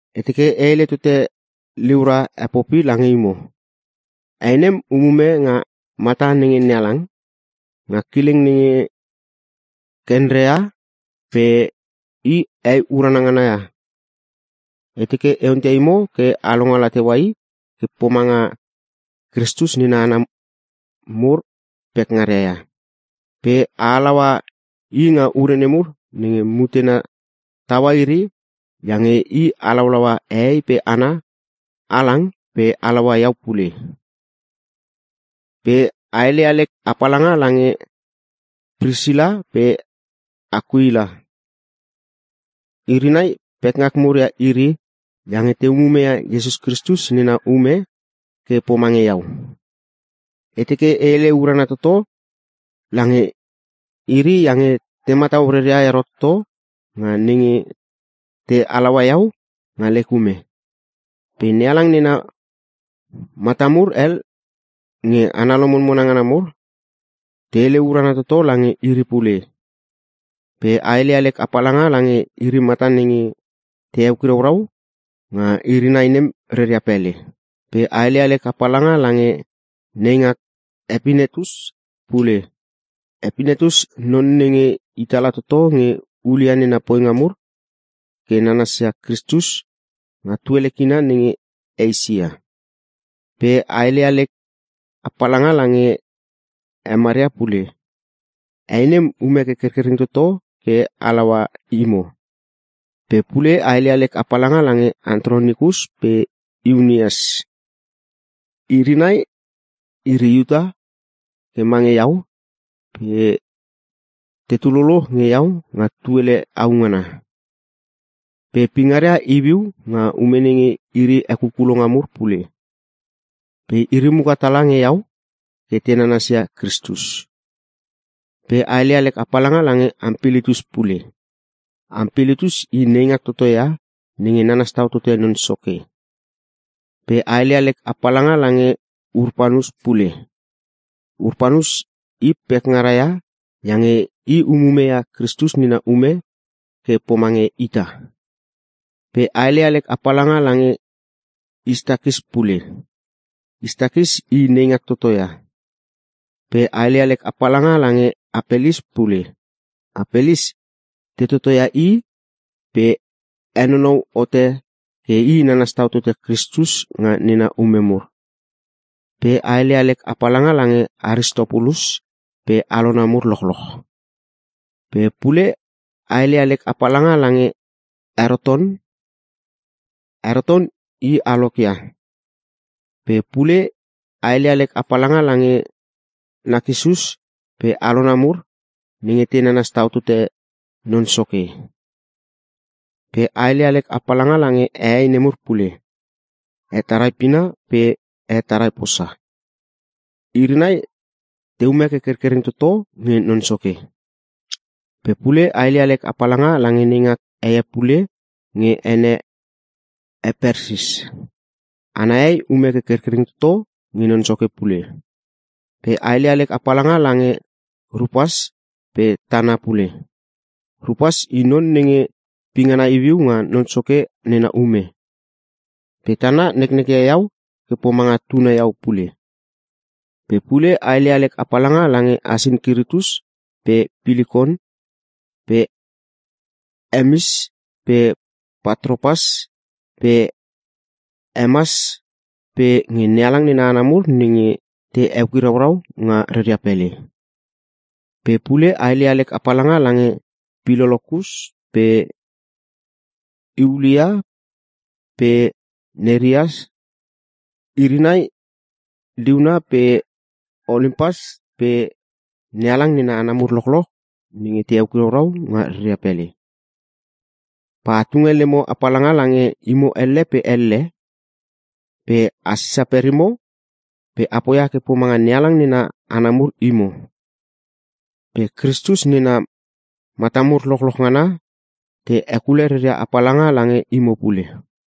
E teke e hele tote liura he Popi lange imo. Hei nem umume nga mata nenge NeHalang nga kileng nenge Kenkrea pe i hei urana ngana ia. E teke e onteia imo ke a longala teua i ke pomanga Kristus nena hana mur pekngaria ia. Pe a halaua i nga ure nemur nenge mutena taua iri iange i halaulaua hehei pe hana halang pe halaua iau pule. Pe a heleia lek apalanga lange Prisila pe Akuila. Iri nai, pekngak mur ia iri iange te umume ia Iesus Kristus nena ume ke pomange iau. E teke e hele urana toto lange iri iange te matau reria ero toto nga nenge te halaua iau nga lek ume. Pe NeHalang nena mata mur hel nge hana lomonmona ngana mur, te hele urana toto lange iri pule. Pe a heleia lek apalanga lange iri mata nenge te hekiraurau nga iri nai nem reria pele. Pe a heleia lek apalanga lange neingak Epinetus pule. Epinetus non nenge i tala toto nge hulia nena poinga mur ke nanasia Kristus nga tuele kina nenge Eisia. Pe a heleia lek apalanga lange he Maria pule. Hei nem ume ke kerkereng toto ke halaulaua imo. Pe pule a heleia lek apalanga lange Antronikus pe Iunias. Iri nai iri Iuta ke mange iau pe tetu luluch nge iau nga tuele au ngana. Pe pingaria iuiu nga ume nenge iri hekulkulonga mur pule, pe iri muka tala nge iau ke te nanasia Kristus. Pe a heleia lek apalanga lange Ampilitus pule. Ampilitus i neingak toto ia nenge nanas tau tote Non Soke. Pe a heleia lek apalanga lange Urpanus pule. Urpanus i pekngara ia iange i umume ia Kristus nena ume ke pomange ita. Pe a heleia lek apalanga lange Istakis pule, Istakis i neingak toto ia. Pe a heleia lek apalanga lange Apelis pule. Apelis, te totoia i pe henonou hote ke i nanas tau tote Kristus nga nena ume mur. Pe a heleia lek apalanga lange Aristopulus pe alona mur lochloch. Pe pule a heleia lek apalanga lange Heroton. Heroton i alok ia. Pe pule a heleia lek apalanga lange Nakisus pe alona mur nenge te nanas tau tote Non Soke. Pe a heleia lek apalanga lange hehei nemur pule, he Taraipina pe he Taraiposa. Iri nai te ume ke kerkereng toto nge Non Soke. Pe pule a heleia lek apalanga lange neingak hei e pule nge ene he Persis. Ana hei ume ke kerkereng toto nge Non Soke pule. Pe a heleia lek apalanga lange Rupas pe tana pule. Rupas i non nenge pingana iuiu nga Non Soke nena ume, pe tana neknek ia iau ke pomanga tuna iau pule. Pe pule a heleia lek apalanga lange Asinkiritus pe Pilikon pe Hemis pe Patropas pe Hemas pe nge NeHalang nena hana mur nenge te eukiraurau nga reria pele. Pe pule a heleia lek apalanga lange Pilolokus pe Iulia pe Nerias iri nai liuna pe Olimpas pe NeHalang nena hana mur lochloch nenge te eukiraurau nga reria pele. A tunge lemo apalanga lange imo elle pe elle pe a sisa perimo pe a poia ke pomanga NeHalang nena hana mur imo. Pe Kristus nena mata mur lochloch ngana te hekule reria apalanga lange imo pule.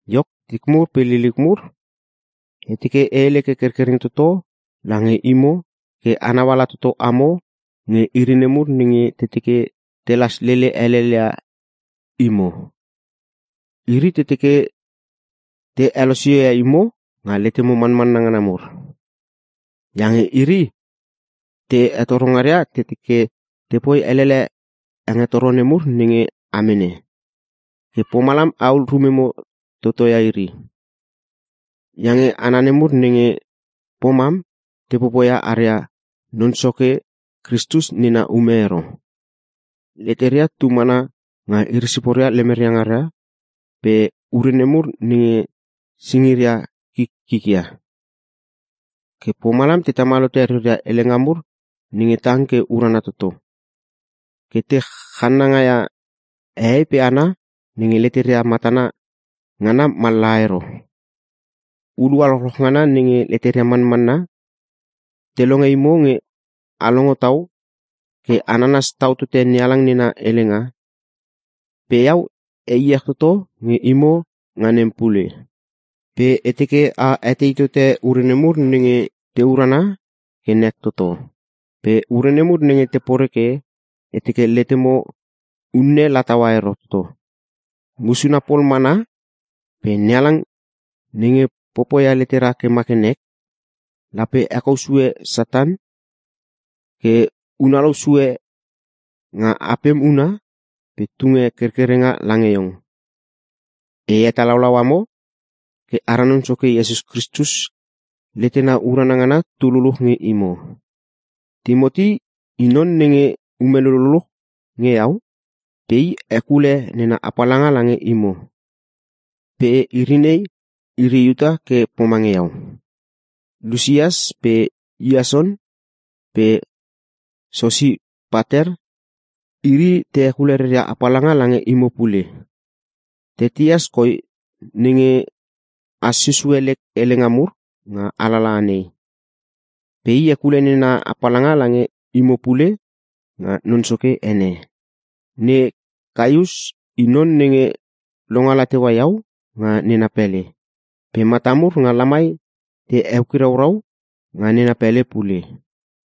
Iok titik mur pe liliuk mur, e teke e hele ke kerkereng toto lange imo ke a nauala toto amo nge iri nemur nenge te teke telas lele helel ia imo. Iri te teke te helosio ia imo nga letemo manmanna ngana mur. Iange iri te hetoro ngaria, te teke tepoi elele hengetoro nemur nenge a mene. Ke pomalam ahul rumemo toto ia iri! Iange hana nemur nenge pomam te popoia ara Non Soke Kristus nena ume ero. Leteria tu mana nga iri siporia lemeria ngaria pe ure mur nenge singiria kikikia. Ke pomalam te tamal hote reria helenga mur nenge tang ke urana toto, ke te channanga ia hehei pe hana nenge leteria matana ngana mallaha ero. Hulua lochloch ngana nenge leteria manmanna te longe imo nge a longo tau ke a nanas tau tote NeHalang nena helenga, pe iau e iech toto nge imo nga nem pule. Pe e teke a etei tote ure nemur nenge te urana ke nek toto. Pe ure nemur nenge te poreke, e teke letemo unne la taua ero toto. Musuna pol mana pe NeHalang nenge popoia letera ke ma ke nek, lape hekou sue Satan ke unalou sue nga apem huna pe tunge kerkerenga lange iong. E hetalaulau amo ke ara Non Soke Iesus Kristus letena urana ngana tu luluch nge imo. Timoti i non nenge ume lululuch nge iau, pe i hekule nena apalanga lange imo. Pe iri nei, iri Iuta ke pomange iau; Lusias pe Iason pe Sosipater. Iri te hekule reria apalanga lange imo pule. Tetias koi nenge has susue lek helenga mur nga alalaha nei. Pe i hekule nena apalanga lange imo pule nga Non Soke ene. Ne Kaius i non nenge longala teua iau nga nena pele. Pe mata mur nga lamai te eukiraurau nga nena pele pule.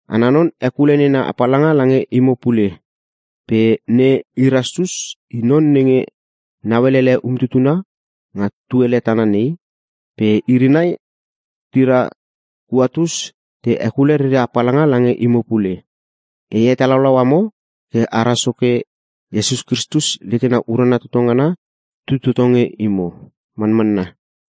Ana non hekule nena apalanga lange imo pule. Pe ne Irastus i non nenge nauelele umtutuna nga tuele tana nei, pe iri nai tira Kuatus te hekule reria apalanga lange imo pule.[ E hetalaulau amo ke ara Soke Iesus Kristus letena urana toto ngana tu toto nge imo. Manmanna.]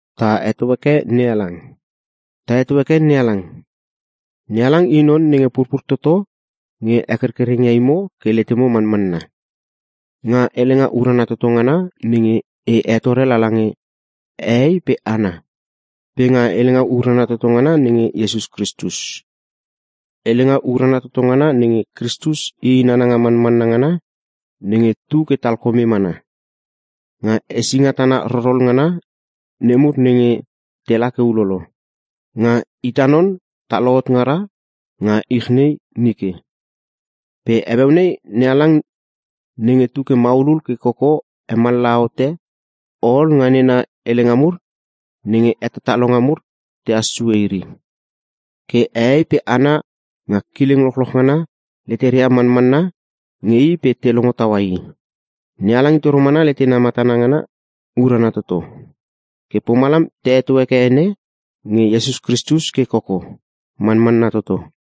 Ta heto heke NeHalang! NeHalang i non nenge purpur toto nge he kerkerengia imo ke letemo manmanna, nga helenga urana toto ngana nenge e hetore lala nge hehei pe hana, pe nga helenga urana toto ngana nenge Iesus Kristus. Helenga urana toto ngana nenge Kristus i nananga manmanna ngana nenge tu ke talkome mana, nga hesinga tana rorol ngana nemur nenge tela ke ulolo, nga ita non ta lohot ngara nga ich nei nike. Pe heueu nei NeHalang nenge tu ke maulul ke koko hemallaha hote ol nga nena helenga mur nenge hetatalonga mur tehas sue iri, ke hehei pe hana nga kileng lochloch ngana leteria manmanna nge i pe te longo taua i. NeHalang i toro mana letena matana ngana urana toto. Ke pomalam ta heto heke ene nge Iesus Kristus ke koko! Manmanna Toto.